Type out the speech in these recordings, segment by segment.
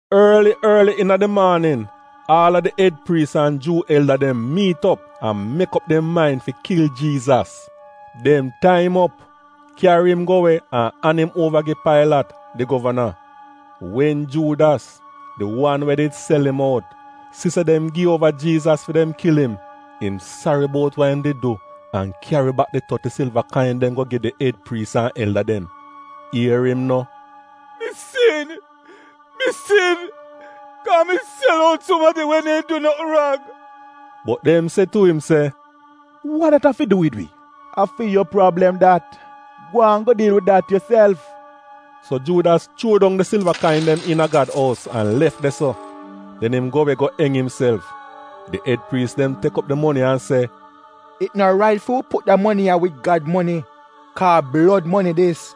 Orli orli iina di maanin, aal a di ed priis an Juu elda dem miit op an mek op dem main fi kil Jiizas. Dem tai im op, kyari im go we an an im uova gi Pailat, di govana. Wen Juudas, di wan we did sel im out, si se dem gi uova Jiizas fi dem kil im, im sari bout wa im did du, an kyari bak di toti silva kain dem go gi di ed priis an elda dem. Ier im no, “Mi sin, mi sin, kaa mi sel out sumadi we neehn du notn rang!” Bot dem se tu im se, “Wa dat av fi du wid wi? A fi yu prablem dat, gwaan go diil wid dat yuself!” So Juudas chuo dong di silva kain dem iina Gad ous an lef de-so. Den im go we go eng imself. Di ed priis dem tek op di moni an se, “It no rait fi wi put da moni ya wid Gad moni, kaa a blod moni dis.”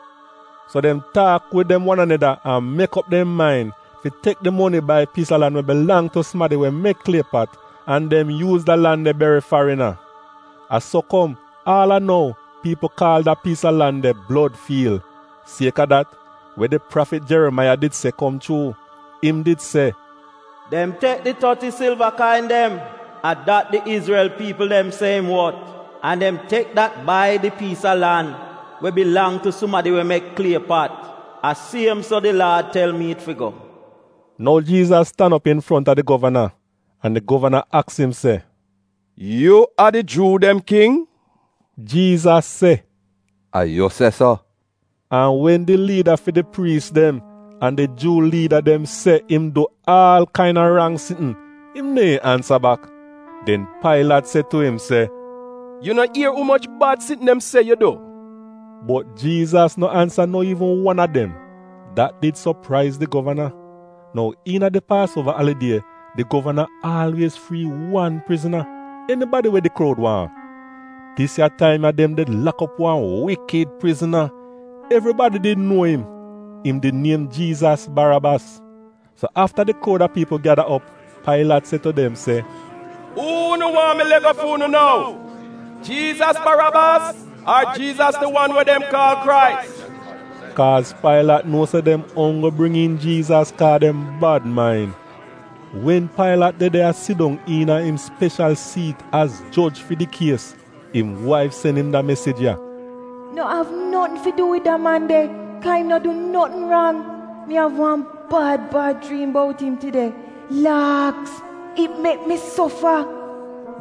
So dem taak wid dem wan aneda an mek op dem main fi tek di moni bai piis a lan we bilang tu sumadi we mek klie pat, an dem yuuz da lan de beri farina. A so kom, aal a nou, piipl kaal da piis a lan de ‘Blod Fiil.’ Sieka dat, we di prafit Jerimaiya did se kom chuu. Im did se: “Dem tek di toti silva kain dem, a dat di Izrel piipl dem se im wot, an dem tek dat bai di piis a lan we bilang tu sumadi we mek klie pat, a siem so di Laad tel mi it fi go.” Nou Jiizas tan op infronta di govana, an di govana aks im se, “Yu a di Juu dem king?” Jiizas se, “A yu se so.” An wen di liida fi di priis dem an di Juu liida dem se im du aal kaina rang sitn, im neehn ansa bak. Den Pailat se tu im se, “Yu no ier umoch bad sitn dem se yu du?” Bot Jiizas no ansa no iivn wan a dem; dat did sopraiz di govana. Nou iina di Paasuova Alidie, di govana aalwiez frii wan prizna; enibadi we di kroud waahn. Dis ya taim dem did lak op wan wikid prizna. Evribadi did nuo im. Im did niem Jiizas Barabas. So afta di kroud a piipl gyada op, Pailat se tu dem se, “Uu unu waahn mi lego fu'unu nou, Jiizas Barabas ar Jiizas di wan we dem kaal Krais?” (Kaaz Pailat nuo se dem onggl bring iin Jiizas kaa dem bad main.) Wen Pailat de de a sidong iina im speshal siit az joj fi di kies, im waif sen im da mesij ya: “No av notn fi du wid da man de kaa im no du notn rang. Mi av wan bad bad jriim bout im tide. Laaks! It mek mi sofa.”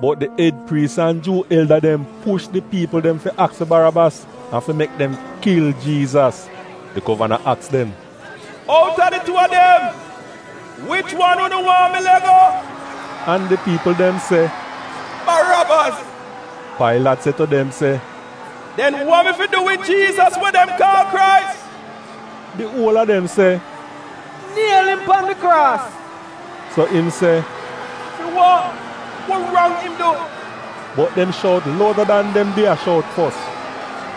Bot di ed priis an Juu elda dem push di piipl dem fi aks fi Barabas an fi mek dem kil Jiizas. Di govana aks dem, “Out a di tuu a dem, wich wan unu waahn mi le'go?” An di piipl dem se, “Barabas!” Pailat se tu dem se, “Den wa mi fi du wid Jiizas we dem kaal Krais?” Di uol a dem se, “Niel im pan di kraas!” So im se, “Fi wa? Wa rang im du?” Bot dem shout louda dan dem did a shout fos,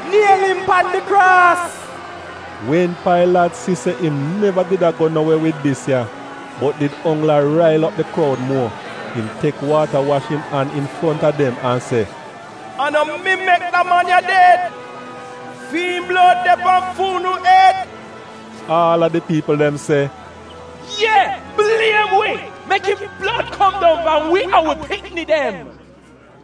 “Niel im pan di kraas!” Wen Pailat si se im neva did a go no we wid dis ya, bot did onggl a rail op di kroud muo, im tek waata wash im an infronta dem an se, “A no mi mek da man ya ded. Fi'im blod de pan fu'unu ed!” Aal a di piipl dem se, “Ye, bliem wi! Mek im blod kom dong pan wi an wi pikni dem!”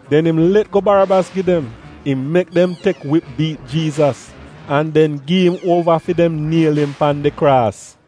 Den im let go Barabas gi dem. Im mek dem tek wip biit Jiizas, an den gi im uova fi dem niel im pan di kraas.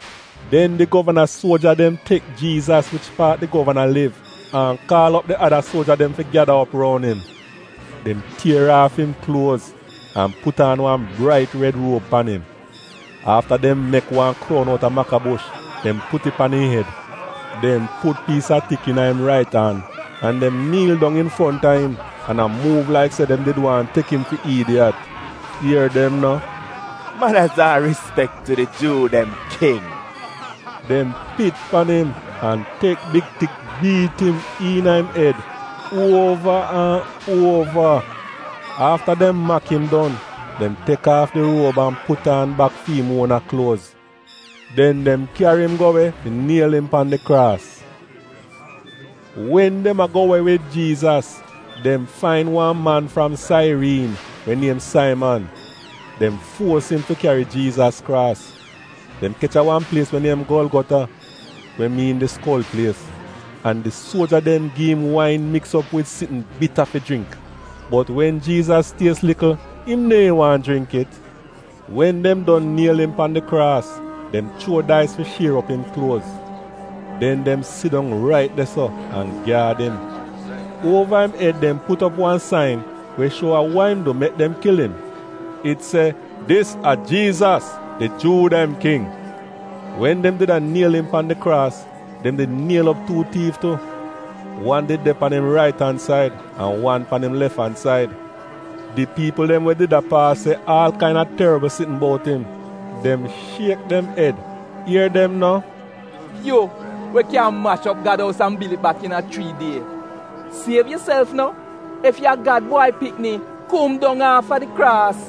Den di govana suoja dem tek Jiizas wich paat di govana liv an kaal op di ada suoja dem fi gyada op roun im. Dem tier aaf im kluoz an put aan wan brait red ruob pan im. Afta dem mek wan kroun outa makabush, dem put it pan im ed. Dem put piis a tik iina im rait an, an dem niil dong infronta im, an a muuv laik se dem did waahn tek im fi iidiyat. Ier dem no, “Manaz an rispek tu di Juu dem King!” Dem pit pan im an tek big tik biit im iina im ed, uova an uova. Afta dem mak im don, dem tek aaf di ruob an put aan bak fi im uona kluoz. Den dem kyari im go we fi niel im pan di kraas. Wen dem a go we wid Jiizas, dem fain wan man fram Sairiin, we niem Saiman. Dem fuos im fi kyari Jiizas kraas. Dem kech a wan plies we niem Golgota (we miin di Skol Plies) an di suoja dem gi im wain miks op wid sitn bita fi jringk, bot wen Jiizas ties likl im neehn waahn jringk it. Wen dem don niel im pan di kraas, dem chuo dais fi shier op im kluoz. Den dem sidong rait de-so an gyaad im. Uova im ed dem put op wan sain we shuo a wa im du mek dem kil im. It se, “DIS A JIIZAS, DI JUU DEM KING.” Wen dem did a niel im pan di kraas, dem did niel op tuu tiif tu. Wan did de pan im rait-an-said an wan pan im lef-an-said. Di piipl dem we did a paas se aal kaina torbl sitn bout im. Dem shiek dem ed. Ier dem no, “Yu, we kyan mash op Gad ous an bil it bak iina chrii die, siev yuself no! Ef ya'a Gad Bwai Pikni, kom dong aafa di kraas!”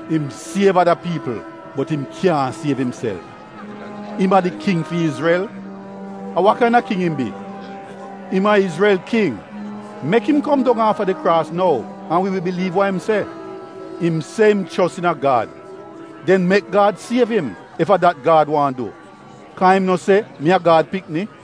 “Im siev ada piipl, bot im kyaahn siev imself! Im a di King fi Izrel? A wa kaina king im bi? Im a Izrel king! Mek im kom dong aafa di kraas nou an wi wi biliiv wa im se. Im se im chos iina Gad, den mek Gad siev im ef a dat Gad waahn du, kaa im no se, ‘Mi a Gad pikni!’”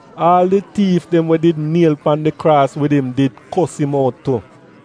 Aal di tiif dem we did niel pan di kraas wid im did kos im out tu.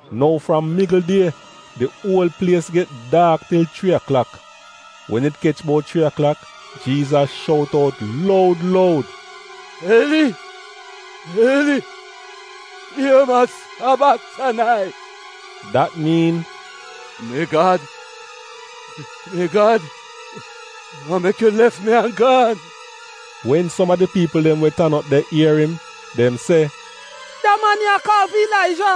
Nou fram migl die di uol plies get daak til chrii aklak. Wen it kech bout chrii aklak, Jiizas shout out loud loud, “Eli, Eli, lema sabaktanai?” Dat miin, “Mi Gad, mi Gad, wa mek yu lef mi an gaan?” Wen som a di piipl dem we did tan op de ier im, dem se, “Da man ya a kaal fi Ilaija.”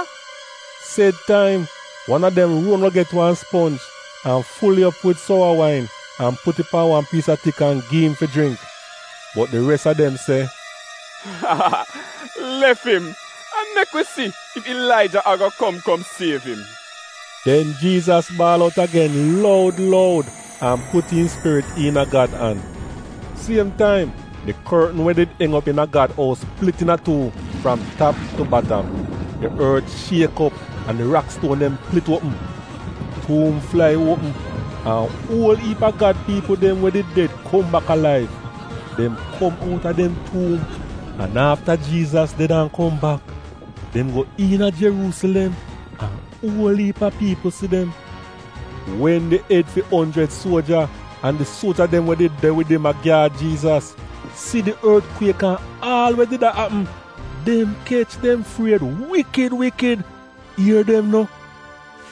Sed taim, wan a dem ron go get wan sponj an ful it op wid sowa wain an put it pan wan piis a tik an gi im fi jringk. Bot di res a dem se, “Lef im an mek wi si ef Ilaija ago kom kom siev im.” Den Jiizas baal out agen loud loud an put im spirit iina Gad an. Siem taim, di kortn we did eng op iina Gad ous plit iina tuu, fram tap tu batam. Di ort shiek op an di rakstuon dem plit uopm. Tuum flai uopm, an uol iip a Gad piipl dem we did ded kom bak alaiv. Dem kom outa dem tuum. An afta Jiizas ded an kom bak, dem go iina Jeruusilem, an uol iip a piipl si dem. Wen di ed fi onjrid suoja, an di suoja dem we did de wid im a gyaad Jiizas, si di ortkwiek an aal we did a apm, dem kech dem fried wikid wikid. Ier dem no,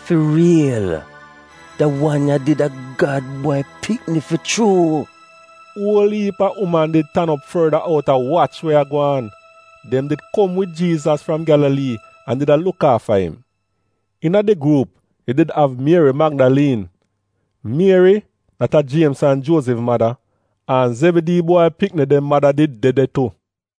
“Fi riil, da wan ya did a Gad Bwai Pikni fi chuu!” Uol iip a uman did tan op forda out a wach we a gwaan. Dem did kom wid Jiizas fram Gyalalii an did a luk aafa im. Iina di gruup, yu did av Mieri Magdaliin, Mieri — dat a Jiemz an Juozif mada, an Zebidii bwai pikni dem mada did de de tu.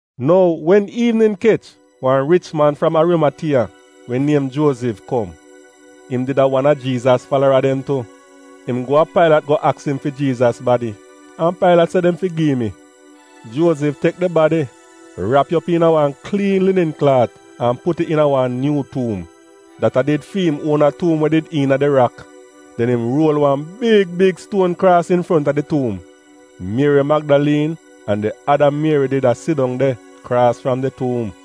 Nou wen iivnin kech, wan rich man fram Arimatiya we niem Juozif, kom. Im did a wan a Jiizas falara dem tu. Im go a Pailat go aks im fi Jiizas badi, an Pailat se dem fi gi im it. Juozif tek di badi, rap it op iina wan kliin linin klaat an put it iina wan nyuu tuum — dat a did fi im uona tuum we did iina di rak. Den im ruol wan big big stuon kraas infronta di tuum. Mieri Magdaliin an di ada Mieri did a sidong de, kraas fram di tuum.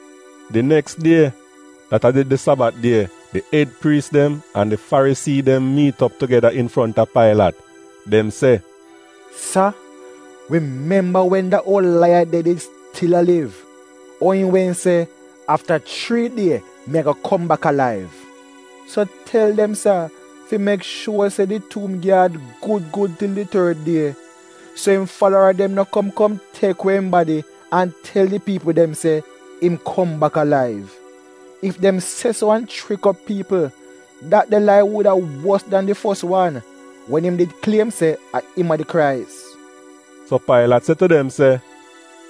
Di neks die, dat a did di Sabat die, di ed priis dem an di Farisii dem miit op tugeda infronta Pailat. Dem se, “Sa, wi memba wen da oul laiyad de did stil a liv, ou im wehn se, ‘Afta chrii die mi ago kom bak alaiv.’ So tel dem sa fi mek shuor se di tuum gyaad gud gud til di tord die, so im falara dem no kom kom tek we im badi an tel di piipl dem se, ‘Im kom bak alaiv.’ Ef dem se so an chrik op piipl, dat de lai wuda wos dan di fos wan, wen im did kliem se a im a di Krais.” So Pailat se tu dem se,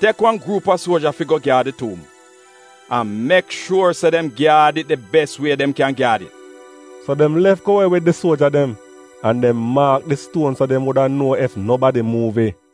“Tek wan gruup a suoja fi go gyaad di tuum, an mek shuor se dem gyaad it di bes wie dem kyan gyaad it.” So dem lef go we wid di suoja dem, an dem maak di stuon so dem wuda nuo ef nobadi muuv it.